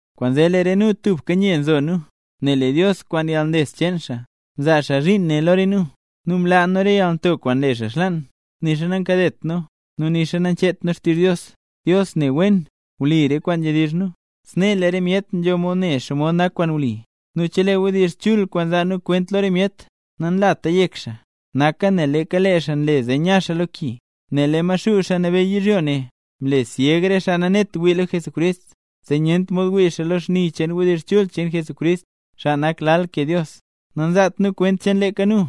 Kwaanzee lee re nu tubka nye nzo nu, nel lee Dios, kwaan yalnles cheen xaa, mzaa xaa zhiin ne lo re nu. Nu mlaa nu re yalnto kwaan nle xaa xlaan; nixa nankadet nu, nixa nancheet nu xtizh Dios. Dios ne wen, wli nu re kwaan nzhedizh nu, snee lee re myet nzho mod ne xomod nak kwaan wli. Nu chelee wdizh chul kwaan nzaa nu kwent lo re myet, nanlat yek xaa, naka nel leeka lee xaa nle zee nya xaa lo ki. Nel lee Maxuu, xaa nabeyy yizhyo ne, mle syeg re xaa nanet wii lo Jesucrist, zee nyent mod wii xaa lo xni cheen wdizh chul cheen Jesucrist, xaa nak lal ke Dios. Nanzaat nu kwent cheen leeka nu,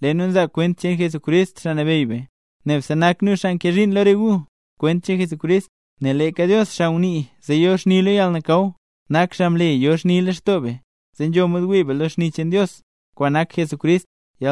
lee nu nzaa kwent cheen Jesucrist, Xaa Nabeyy be. Nebse nak nu xaa nkee zhiin lo re gu, kwent cheen Jesucrist. Nel leeka Dios, xaa ngunii zee yo xni lo yalnakaw, nak xaa mle yo xni lextoo be, zee nzho mod wii be lo xni cheen Dios, kwaan nak Jesucrist.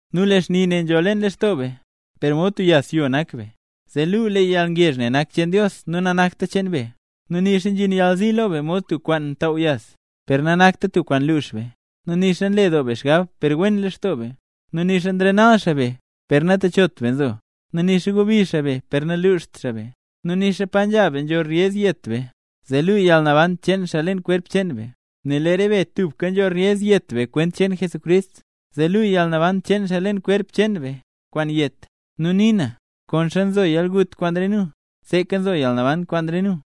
Nu lee xni ne nzho leen lextoo be. Per mod tub yas yo nak be, zee luu lee yalngezh ne nak cheen Dios nu nanakta cheen be. Nu nixa nzhin yalzi lo be mod tub kwaan ntaaw yas, per nanakta tub kwaan lux be. Nu nixa nle doo be xgab per wen lextoo be. Nu nixa nrenal xaa be, per natechot be nzo, nu nixa gobi xaa be per naluxt xaa be. Nu nixa pa nzha be nzho ryez yet be, zee luu yalnaban cheen xaa leen kwerp cheen be. Nel lee re be tubka nzho reyez yet be kwent cheen Jesucrist, zee luu yalnaban cheen xaa leen kwerp cheen be, kwaan yet. Nu nii na, konxa nzo yalgut kwaan re nu, seeka nzo yalnaban kwaan re gu.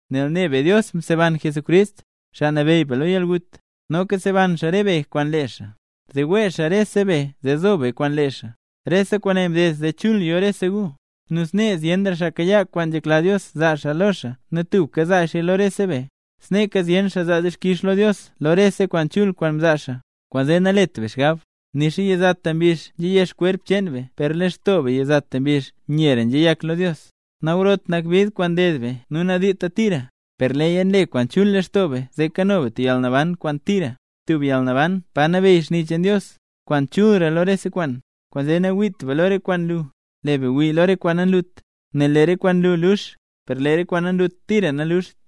Nel ne be Dios mseban Jesucrist, Xaa Nabeyy be lo yalgut, noka seban xaa re be kwaan lee xaa, zee wee xaa rese be zee zo be kwaan lee xaa. Rese kwaane mded zee chul yo rese gu, nu snee zyenra xaa kayaa kwaan nzhekla Dios zaa xaa lo xaa nu tubka zaa xaaya lo rese be, sneeka zyen xaa zaa dixkix lo Dios lo rese kwaan chul kwaan mzaa xaa. Kwaanzee nalet be xgab. Nixa yizata mbizh nzheyex kwerp cheen be per lee lextoo be yizata mbizh nyera nzheyak lo Dios. Nagrot nak bid kwaan nded be nu nadiita tira, per leeya nle kwaan chul lextoo be zee kano be tub yalnaban kwaan tira, tub yalnaban pa nabeyy xni cheen Dios, kwaan chulra lo rese kwaan. Kwaanzee nangwiit be lo re kwaan nlu, lee be ngwii lo re kwaan nanlut, nel lee re kwaan nlu lux, per lee re kwaan nanlut tira naluxt.